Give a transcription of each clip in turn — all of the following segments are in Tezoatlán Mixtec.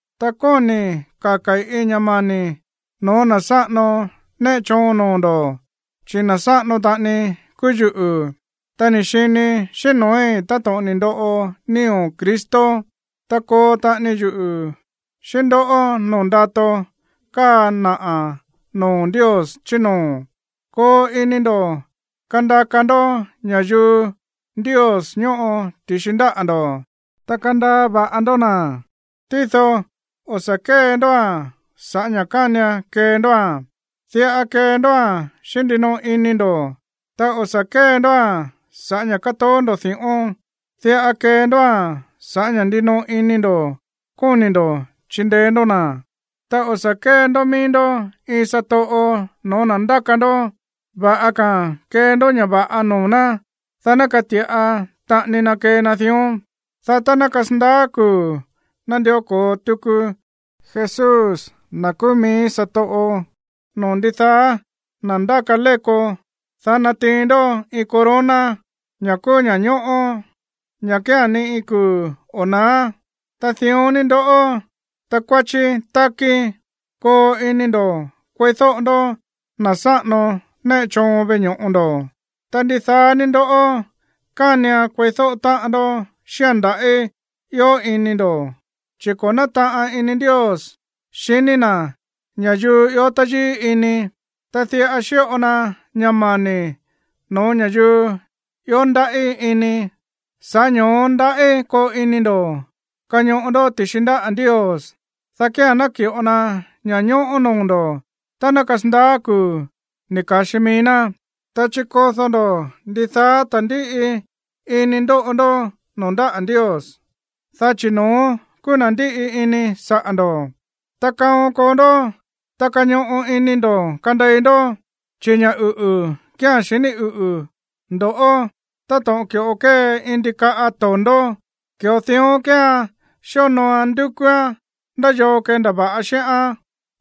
Ta kóni̱i̱ kaka̱i̱ iin ña̱ mani̱ no̱ó na̱ sáꞌano néꞌe choon noo̱ ndo̱, chi̱ na̱ sáꞌano taꞌani kúú yuꞌu̱. Ta ni̱ xini xíꞌín no̱ói̱ táto̱ꞌon ni̱ ndoꞌo nío̱ Cristo, ta koo taꞌani yuꞌu̱ xíꞌín ndó noo̱ ndato káa naꞌa̱ noo̱ Ndios chí noo̱. Koo ini ndo̱ kandaka ndó ña̱yuu Ndios ñóꞌo ti̱xi ndáꞌa̱ ndo̱, ta kandaa va̱ꞌa ndó na̱, tído o̱ sa̱ kée ndóa̱n sa̱ꞌá ña̱ kánian kee ndóa̱n, diꞌa kee ndóa̱n xíꞌín ndinoꞌo ini ndo̱. Ta o̱ sa̱ kée ndóa̱n sa̱ꞌá ña̱ kátoó ndo̱ di̱ꞌón. Diꞌa kee ndóa̱n sa̱ꞌá ña̱ ndinoꞌo ini ndo̱ kóni̱ ndo̱ chindeé ndó na̱. Ta o̱ sa̱ kée ndó míí ndó iin satoꞌo no̱ó na̱ ndáka ndó. Va̱ꞌa ka̱a̱n kee ndó ña̱ va̱ꞌa noo̱ ná, dá ná kati̱ꞌa taꞌani na kee na dión. Dá tá ná kasandaá kuu̱ nandió ko̱o tuku Jesús, na̱ kúú míí satoꞌo noo̱ ndidaá na̱ ndáka léko, dá natiin ndó iin corona, ña̱ kúú ña̱ñóꞌó, ña̱ kía̱n ni iin kuu̱ o̱ na̱á. Ta dión ni ndoꞌó, takuáchí tákí, koo ini ndo̱ kueídóꞌo ndó na̱ sáꞌano néꞌe choon veꞌe ño̱ꞌo ndo̱. Ta ndidaá ní ndó kánian kueídóꞌo táꞌan ndó xíꞌa̱n nda̱ꞌí ió ini ndo̱, chi̱: Ko̱ nátaꞌan ini Ndios xiní na̱ ña̱yuu ió táyíí ini, ta diꞌa xíꞌo na ña̱ mani̱ no̱ó ña̱yuu ió ndaꞌí ini. Sa̱ꞌá ño̱ó ndaꞌí koo ini ndo̱ kañoꞌo ndó ti̱xi ndáꞌa̱ Ndios, dá kía̱n ná ki̱ꞌo na ña̱ñóꞌó noo̱ ndo̱ tá ná kasandaá kuu̱ ni̱ ka̱xi mií ná. Ta chikodó ndó ndidaá ta̱ndíꞌi ini ndóꞌo ndó noo̱ ndáꞌa̱ Ndios, dá chi̱ no̱ón kúú na̱ ndíꞌi ini saꞌa̱ ndo̱. Ta kaon koo ndó, ta kañoꞌo ini ndo̱ kandei ndó, chi̱ ña̱ uꞌu̱ kía̱n xiní uꞌu̱ ndo̱ꞌó. Táto̱ꞌon ki̱ꞌo kée iin ndikaꞌa to̱ndó, ki̱ꞌo dión kéean xíonooan ndúkúán ndá yoo kendava̱ꞌa xíꞌán.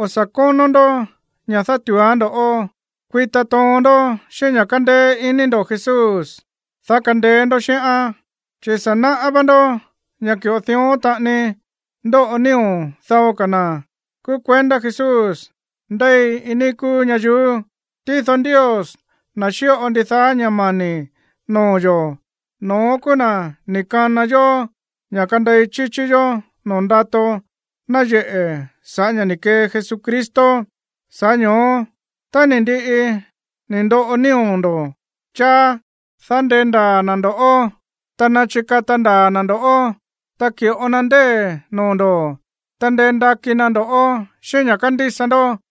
O̱ sa̱ kónó ndó ña̱ dátu̱úán ndo̱ꞌó. Kuita toon ndó xíꞌín ña̱ kándéé iní ndo̱ Jesús, dá kandeé ndó xíꞌán. Chi̱ sa̱ náꞌá vá ndó ña̱ ki̱ꞌo dión taꞌani ndóꞌo nío̱ dao ka̱ na̱ kúú kuendá Jesús ndéi iin níí kúú ñayuú. Tído Ndios, na̱ xíꞌo ndidaá ña̱ mani̱ noo̱ yo̱, no̱ón kúú na̱ ni̱ kana yó ña̱ kandei chíchí yó noo̱ ndato náyeꞌe̱ sa̱ꞌá ña̱ ni̱ kee Jesucristo. Sa̱ꞌá ño̱ó, tá ni̱ ndiꞌi ni̱ ndoꞌo nío̱ ndo̱ cháá, dá ndendaa̱ na̱ ndo̱ꞌó, ta nachikata ndaa̱ na̱ ndo̱ꞌó, ta ki̱ꞌo na ndée̱ noo̱ ndo̱, ta ndendakí ná ndo̱ꞌó xíꞌín ña̱ kándísa ndó.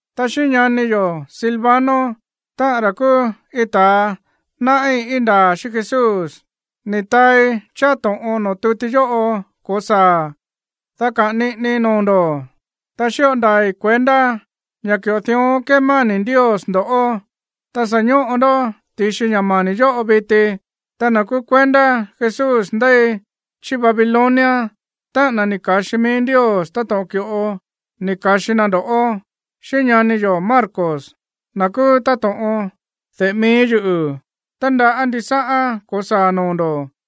Ta xíꞌín ñani yo̱ Silvano, táꞌa̱n ra̱ kúú iin ta̱a náꞌí íin ndaa̱ xíꞌín Jesús, ni̱ taai cháá to̱ꞌon noo̱ tuti yóꞌo ko̱saa̱a̱n, dá kaꞌa̱n niꞌinii noo̱ ndo̱, ta xíꞌo ndaa̱i̱ kuendá ña̱ ki̱ꞌo dión kémani̱ Ndios ndo̱ꞌó, ta sa̱ ñóꞌo ndó ti̱xi ña̱ mani̱ yóꞌo viti. Ta na̱ kúú kuendá Jesús ndéi chí Babilonia, táꞌa̱n na̱ ni̱ ka̱xi mií Ndios táto̱ꞌon ki̱ꞌo ni̱ ka̱xi na ndo̱ꞌó, xíꞌín ñani yo̱ Marcos, na̱ kúú táto̱ꞌon de̱ꞌe mií yuꞌu̱, tándaꞌá ndisáꞌán ko̱saa̱ noo̱ ndo̱.